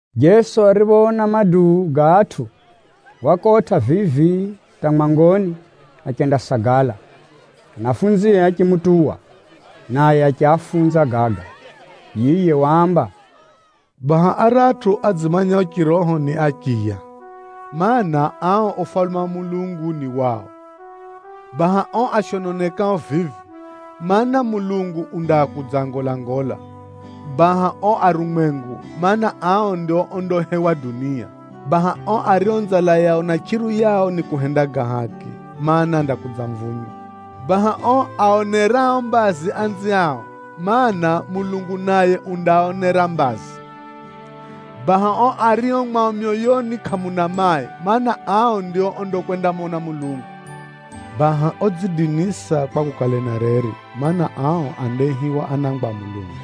Jeso ariphoona maduu ga atʼu, wakotʼa vivi hata mwangoni achendasagala. Anafunzie achimutuwa, naye achiafunza gaga. Yiye waamba, “Baha aratʼu adzimanyao chiroho ni achiya, mana, ao Ufalume wa Mulungu ni wao. Baha o ashononekao vivi, mana, Mulungu undakudzaangolangola. Baha o arumwengu, mana, ao ndio ondahewa dunia. Baha ao ario nzala yao na chʼiru yao ni kuhenda ga haki, mana, andakudzamvunywa. Baha ao aaonerao mbazi anziao, mana, Mulungu naye undaaonera mbazi. Baha ao ario mwao myoyoni kʼamuna mai, mana, ao ndio ondakwendamona Mulungu. Baha odzidinisa kwa kukale na reri, mana, ao andaihiwa anangwa a Mulungu.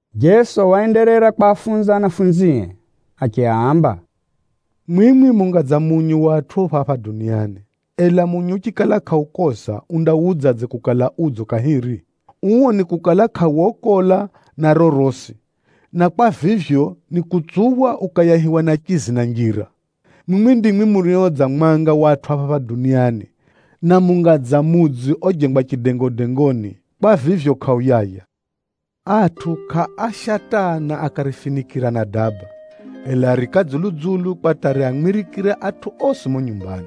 Jeso waenderera kwafunza anafunzie achiaamba, “Mwimwi munga dza munyu wa atʼu phapha duniani. Ela munyu uchikala kʼaukoza, undawudzadze kukala udzo kahiri? Uo nikukala kʼawokola na rorosi, na kwa vivyo, nikutsuphwa ukayahiwa ni achizi na njira. “Mwimwi ndimwi murio dza mwanga wa atʼu phapha duniani, na munga dza mudzi ojengwa chidengodengoni, kwa vivyo kʼauyaya. Atʼu kʼaasha taa na akarifinikʼira na daba, ela ariika dzulu-dzulu kwa hata riamwirikire atʼu osi mumo nyumbani.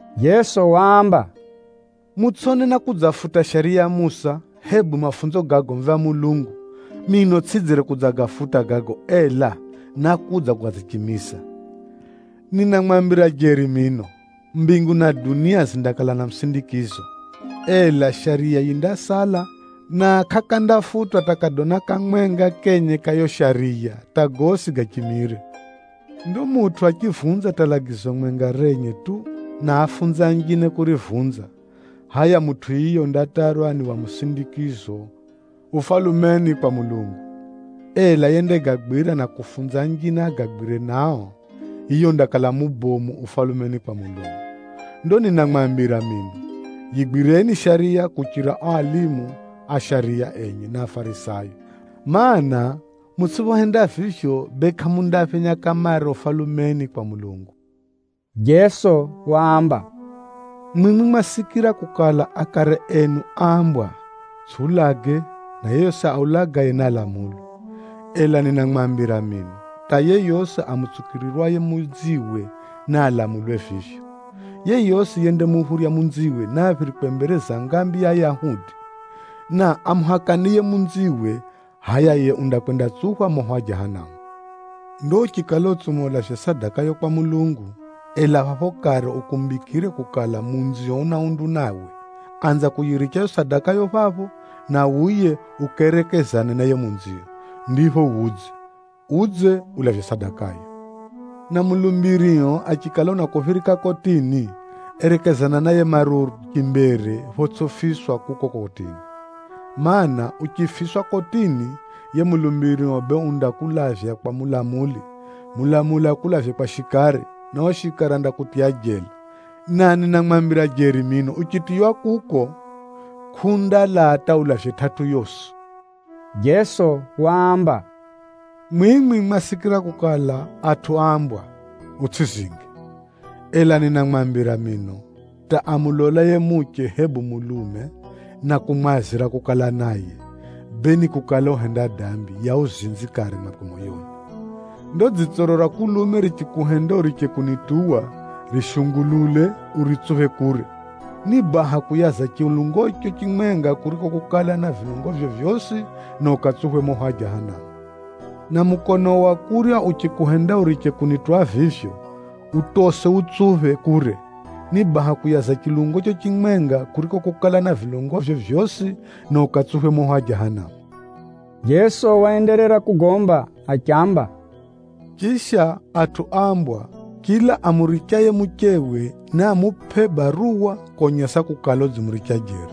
Jeso waamba, “Mutsʼone nákudzafuta Shariya ya Musa, hebu mafunzo ga agomvi a Mulungu. Mino tsʼidzire kudzagafuta gago, ela, nákudza kudzagachimiza. Ninamwambira jeri mino, mbingu na dunia zindakala na musindikizo, ela Shariya yindasala, na kʼakandafutwa hata kadona kamwenga kenye ka yiyo Shariya, hata gosi gachimire. Ndo mutʼu achivunza hata lagizo mwenga renye tu, na aafunze anjine kurivunza, hʼaya mutʼu yiye undatarwa ni wa musindikizo Ufalumeni kwa Mulungu. Ela yendagagwira na kufunza anjine agagwire nao, yiye undakala mubomu Ufalumeni kwa Mulungu. Ndo ninamwambira mino, yigwireni Shariya kuchira ao alimu a shariya enye na Afarisayo, mana, mutsʼiphohenda vivyo, bee kʼamundaphenya kamare Ufalumeni kwa Mulungu.” Jeso waamba, “Mwimwi mwasikira kukala akare enu áambwa, ‘Utsʼiulage,’ na ‘Yeyosi aulagaye nialamulwe.’ Ela ninamwambira mino, hata yeyosi amutsukirirwaye munziwe, Nakala zinjine zinaonjeza: photsʼi chausa. nialamulwe vivyo. Yeyosi yendamuphurya munziwe, niaphirikwe mbere za ngambi ya Ayahudi. Na amuhakanaye munziwe, hʼaya yiye undakwendatsuphwa moho wa Jahanamu. Ndo uchikala utsuma ulavye sadakayo kwa Mulungu, ela phapho kare ukumbikire kukala munzio una undu nawe, anza kuyiricha yiyo sadakayo phapho, na wuye ukerekezane na yiye munzio, ndipho wudze, udze ulavye sadakayo. Na mulumbirio achikala unakuphirika kotini, erekezana naye maruru chimbere photsʼifiswa kuko kotini. Maana, uchifiswa kotini, yiye mulumbirio bee undakulavya kwa mulamuli, mulamuli akulavye kwa shikari, na yiye shikari andakutiya jela. Na ninamwambira jeri mino, uchitiywa kuko, kʼundalaa hata ulavye tʼatʼu yosi.” Jeso waamba, “Mwimwi mwasikira kukala atʼu áambwa, ‘Utsʼizinge!’ Ela ninamwambira mino, hata amulolaye muche hebu mulume, na kumwazira kukala naye, bee ni kukala uhenda dambi ya uzinzi kare mwakwe moyoni. Ndo dzitsoro ra kulume richikuhenda uriche kunituwa, rishungulule uritsuphe kure. Ni baha kuyaza chilungocho chimwenga kuriko kukala na vilungovyo vyosi, na ukatsuphwe moho wa Jahanamu. Na mukonoo wa kurya uchikuhenda uriche kunituwa vivyo, utose wutsuphe kure. Ni baha kuyaza chilungocho chimwenga kuriko kukala na vilungovyo vyosi, na ukatsuphwe moho wa Jahanamu.” Jeso waenderera kugomba achiamba, “Chisha atʼu áambwa, ‘Chila amurichaye muchewe, niamupʼe baruwa konyesa kukala, udzimuricha jeri.’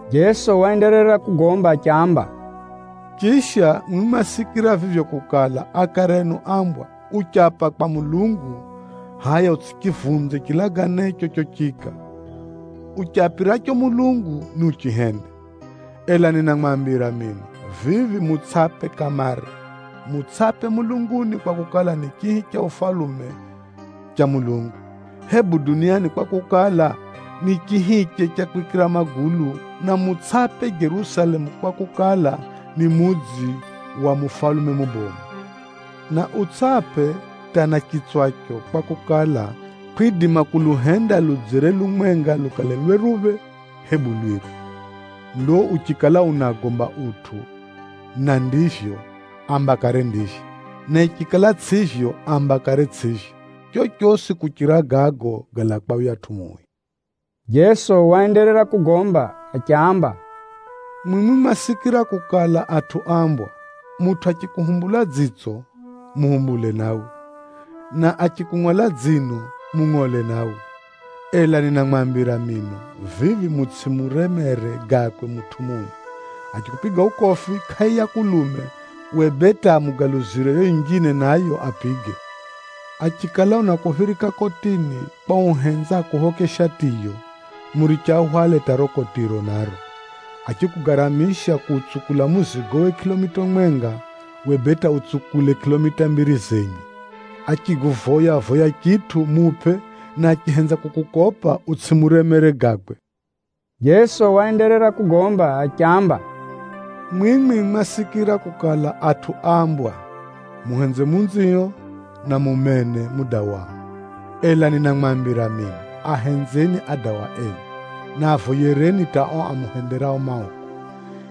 Jeso waenderera kugomba achiamba, “Chisha, mwimwi mwasikira vivyo kukala akare enu áambwa, ‘Uchapa kwa Mulungu, hʼaya utsʼichivunze chilaganecho chochiika. Uchapiracho Mulungu, niuchihende.’ Ela ninamwambira mino, vivi mutsʼape kamare. Mutsʼape mulunguni kwakukala, ni chihi cha ufalume cha Mulungu, hebu duniani kwakukala, ni chihiche cha kwikira magulu. Na mutsʼape Jerusalemu kwakukala, ni mudzi wa mufalume mubomu. Na utsʼape hata na chitswacho kwakukala, kʼwidima kuluhenda ludzere lumwenga lukale lweruphe, hebu lwiru. Ndo uchikala unagomba utʼu na ndivyo, amba kare, ‘Ndivyo.’ Na chikala tsʼivyo, amba kare, ‘Tsʼivyo.’ Chochosi kuchira gago, galaa kwa yuyatʼu Mui.” Jeso waenderera kugomba achiamba, “Mwimwi mwasikira kukala atʼu áambwa, ‘Mutʼu achimuhumbula munjine dzitso, naye nahumbulwe dsitso, na achimungʼola dzino, naye naangʼolwe dzino.’ Ela ninamwambira mino, vivi mutsʼimuremere gakwe mutʼu mui. Achikupiga ukofi kʼai ya kulume, uwe bee hata mugaluzire yiyo yinjine nayo apige. Achikala unakuphirika kotini kwa uhenza akuphoke shatiyo, muriche ahwale hata riro kotiro naro. Achikugaramisha kuutsukula muzigowe kʼilomita mwenga, uwe bee hata utsukule kʼilomita mbiri zenye. Achikuvoya-voya chitʼu, mupʼe, na achihenza kukukopa, utsʼimuremere gakwe.” Jeso waenderera kugomba achiamba, “Mwimwi mwasikira kukala atʼu áambwa, ‘Muhenze jiranio, na mumene mudawao.’ Ela ninamwambira mino, ahenzeni adawa enu, na avoyereni hata ao amuhenderao mauku.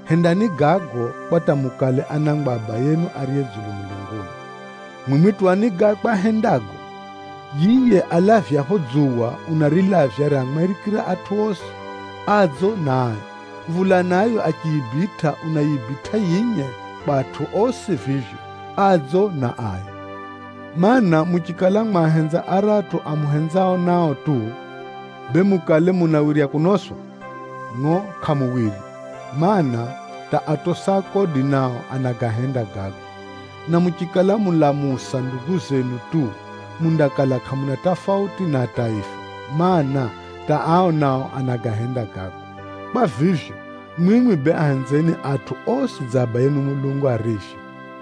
Hendani gago, kwa hata mukale anangwa a Abayenu ariye dzulu mulunguni. Mwimwi tuwani gakwe ahendago. Yiye alavyapho dzuwa, unarilavya riamwirikire atʼu osi, adzo na ai. Mvula nayo achiyibitʼa, unayibitʼa yinye kwa atʼu osi vivyo, adzo na ai. Maana, muchikala mwahenza aratʼu amuhenzao nao tu, bee mukale munawirya kunoswa? Ngʼo kʼamuwirya, mana, hata atosi a kodi nao anagahenda gago! Na muchikala mulamusa ndugu zenu tu, mundakala kʼamuna tafauti na ataifa, mana, hata ataifa nao anagahenda gago. Kwa vivyo, mwimwi bee ahenzeni atʼu osi dza Abayenu Mulungu arivyo.”